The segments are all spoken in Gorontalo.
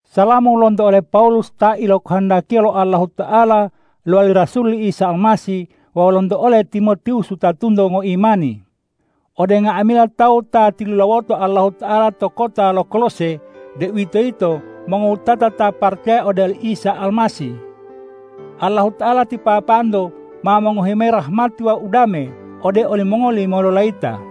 Salamu lonto ole Pawulus ta ilokohondakiya lo Allahuta'ala lowali rasul li Isa Almasih wawu lonto ole Timotiwus wutatunto ngoimani ode nga'amila tawu ta tilulawoto Allahuta'ala to kota lo Kolose, deuwitoyito mongowutata ta paracaya ode oli Isa Almasih. Allahuta'ala ti Papanto ma mongohi mayi rahmati wawu udame ode olimongoli mololayita.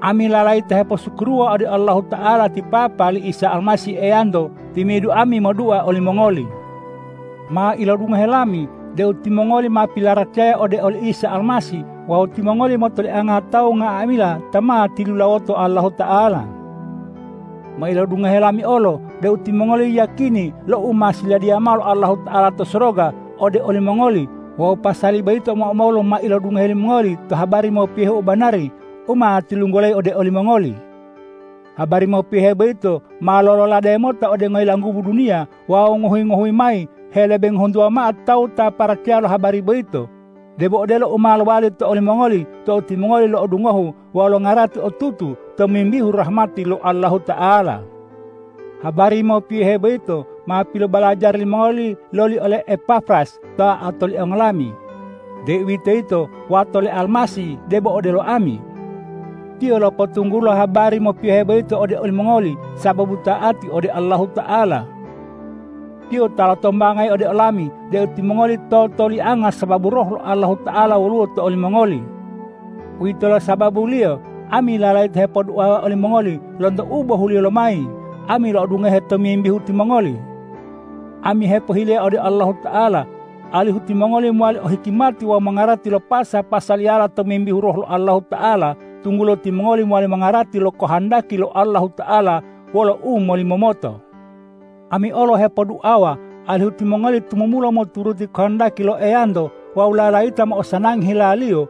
Ami lalayita heposukuruwa ode Allahuta'ala ti Papa li Isa Almasih Eyanto timi'idu ami modua olimongoli. Ma ilodungohe lami deu timongoli ma pilaracaya ode oli Isa Almasih wawu timongoli motolianga tawu nga'amila ta ma tilulawoto Allahuta'ala. Ma ilodungohe lami olo deu timongoli yiyakini lo u ma siladiya mao lo Allahuta'ala to soroga ode olimongoli wawu pasali boyito omo-omolu ma ilodungohe limongoli to habari mopiyohe u banari u ma tilunggulayi ode olimongoli. Habari mopiyohe boyito ma lololade mota ode ngoyilanggubu duniya wawu ngohuyi-ngohuyi mayi helebe ngohuntuwa mao tawu ta paracaya lo habari boyito, debo odelo u ma lowali to olimongoli tou timongoli lo'odungohu wawu longarati otutu tomimbihu rahmati lo Allahuta'ala. Habari mopiyohe boyito ma pilobalajari limongoli loli ole Epafras ta otoliango lami, deuwitoyito wato le Almasih debo odelo ami. Tiyo lopotunggulo habari mopiyohe boyito ode olimongoli sababu ta'ati ode Allahuta'ala. Tiyo ta lotombangayi ode olami deu timongoli totolianga sababu Roh lo Allahuta'ala woluwo to olimongoli. Uwitolo sababuliyo ami lalayita hepoduawa olimongoli lonto u bohuliyo lomayi ami lo'odungohe tomimbihu timongoli. Ami hepohileya ode Allahuta'ala, alihu timongoli mowali o hikimati wawu mongarati lo pasa-pasaliyala tomimbihu Roh lo Allahuta'ala, tunggulo timongoli mowali mongarati lo kohondaki lo Allahuta'ala wolo umolimomoto. Ami olo hepoduawa alihu timongoli tumumulo moturuti kohondaki lo Eyanto wawu lalayita mo'osanangi hila-Liyo,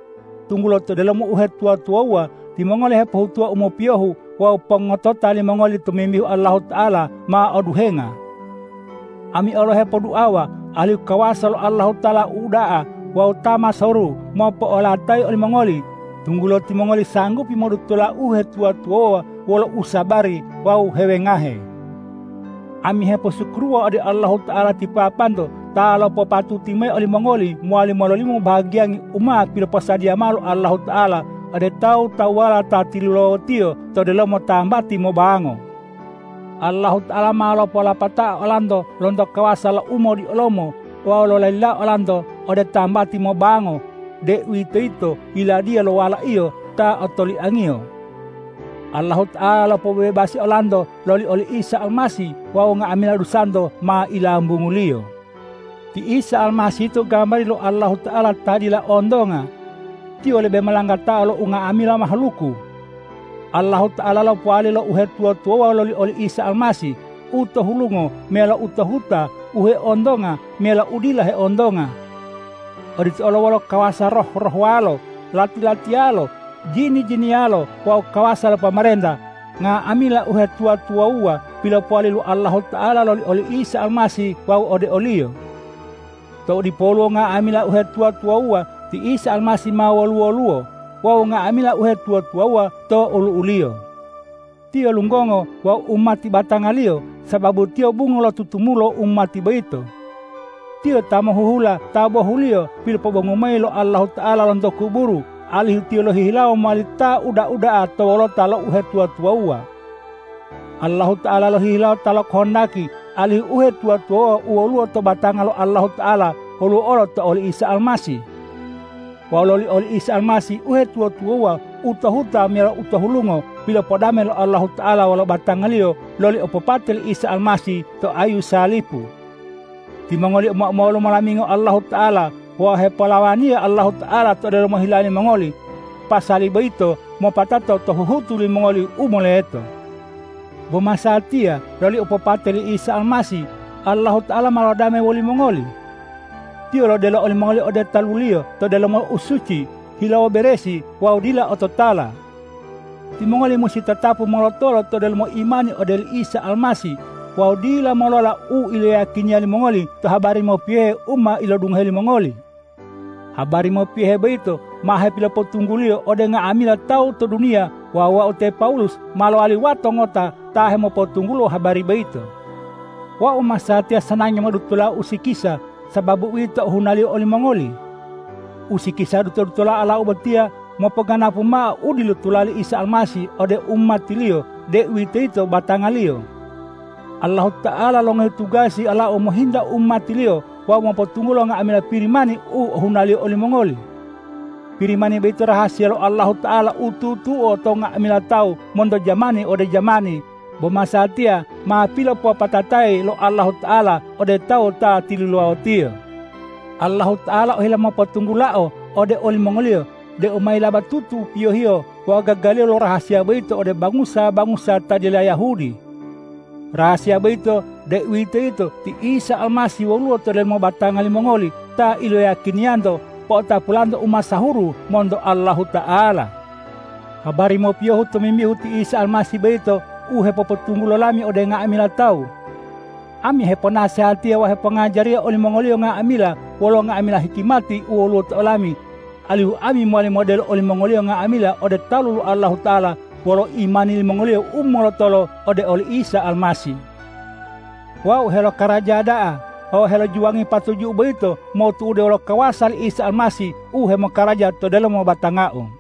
tunggulo to delomo uhetuwa-tuwawuwa timongoli hepohutuwa u mopiyohu wawu pongotota limongoli tomimbihu Allahuta'ala ma oduhenga. Ami olo hepoduawa alihu kawasa lo Allahuta'ala u uda'a wawu ta masahuru mopo'olotolayi olimongoli, tunggulo timongoli sanggupi modutola uhetuwa-tuwawuwa wolo usabari wawu hewengahe. Ami heposukuruwa ode Allahuta'ala ti Papanto ta lopopatuti mayi olimongoli mowali mololimo bahagiyangi u ma piloposadiya mao lo Allahuta'ala ode tawu-tawuwala ta tilulawo-Tiyo to delomo tambati mobango. Allahuta'ala ma lopolopatao olanto lonto kawasa lo umodiolomo wawu lolalilao olanto ode tambati mobango, deuwitoyito Yiladiya lo Wala-Iyo ta otoliang-Iyo. Allahuta'ala lopobebasi olanto loli oli Isa Almasih wawu nga'amila dusanto ma ilambungu-Liyo. Ti Isa Almasih yito gambari lo Allahuta'ala ta dila ontonga. Tiyo lebe molanggatao lo nga'amila mahaluku. Allahuta'ala lopowali lo uhetuwa-tuwawuwa loli oli Isa Almasih, u to hulungo meyalo u to huta, u heontonga meyalo u dila heontonga. Odito olo kawasa lo roh-rohwalo, lati-latiyalo, jini-jiniyalo wawu kawasa lo pomarenta. Nga'amila u hetuwa-tuwawuwa pilopowali lo Allahuta'ala loli oli Isa Almasih wawu ode o-Liyo. Tou dipoluwo nga'amila uhetuwa-tuwawuwa, ti Isa Almasih ma wolu-woluwo. Wawu nga'amila uhetuwa-tuwawuwa to olu'u-Liyo. Tiyo lunggongo wawu umati batanga-Liyo, sababu Tiyo bungo lo tutumulo umati boyito. Tiyo ta mohuhula ta bohuliyo pilopobongu mayi lo Allahuta'ala lonto kuburu, alihu Tiyo lohihilawo mowali ta uda-uda'a to wolota lo uhetuwa-tuwawuwa. Allahuta'ala lohihilawo ta lokohondaki alihu uhetuwa-tuwawuwa u woluwo to batanga lo Allahuta'ala, woluwo olo to oli Isa Almasih. Wawu loli oli Isa Almasih uhetuwa-tuwawuwa u to huta meyalo u to hulungo pilopodame lo Allahuta'ala wolo batanga-Liyo loli opopate li Isa Almasih to ayu salipu. Timongoli omo-omolu molamingo Allahuta'ala wawu hepolawaniya Allahuta'ala to delomo hila limongoli. Pasali boyito mopatato to huhutu limongoli u moleto. Bo masatiya loli opopate li Isa Almasih, Allahuta'ala ma lodame wolimongoli. Tiyo lodelo olimongoli ode talu-Liyo to delomo usuci, hilawo beresi wawu dila ototala. Timongoli musi tatapu molotolo to delomo imani ode oli Isa Almasih wawu dila molola u iloyiyakiniya limongoli to habari mopiyohe u ma ilodungohe limongoli. Habari mopiyohe boyito ma hepilopotungguliyo ode nga'amila tawu to duniya wawu wau te Pawulus ma lowali wato ngota ta hemopotunggulo habari boyito. Wau masatiya sanangi modutola usikisa, sababu uwito ohunaliyo olimongoli. Usikisa duto-dutola olau botiya mopoganapu mao u dilutola li Isa Almasih ode umati-Liyo, deuwitoyito batanga-Liyo. Allahuta'ala longohi tugasi olau mohinta umati-Liyo wawu mopotunggulo nga'amila Pirimani u ohunaliyo olimongoli. Pirimani boyito rahasiya lo Allahuta'ala u tutuo to nga'amila tawu monto jamani ode jamani, bo masatiya ma pilopopatatayi lo Allahuta'ala ode tawu ta tilulawo-Tiyo. Allahuta'ala ohila mopotunggulao ode olimongoliyo deu ma yilabatutu piyohiyo wawu gagaliyo lo rahasiya boyito ode bangusa-bangusa ta dila Yahudi. Rahasiya boyito, deuwitoyito ti Isa Almasih woluwo to delomo batanga limongoli ta iloyiyakiniyanto po'otapulanto umasahuru monto Allahuta'ala. Habari mopiyohu tomimbihu ti Isa Almasih boyito u hepopotunggulo lami ode nga'amila tawu. Ami heponasehatiya wawu hepongajariya olimongoliyo nga'amila wolo nga'amila hikimati u woluwo to olami, alihu ami mowali modelo olimongoliyo nga'amila ode talu lo Allahuta'ala wolo imani limongoliyo u molotolo ode oli Isa Almasih. Wau helokaraja da'a wawu helojuwangi patuju'u boyito motu'ude wolo kawasa li Isa Almasih u hemokaraja to delomo batangau.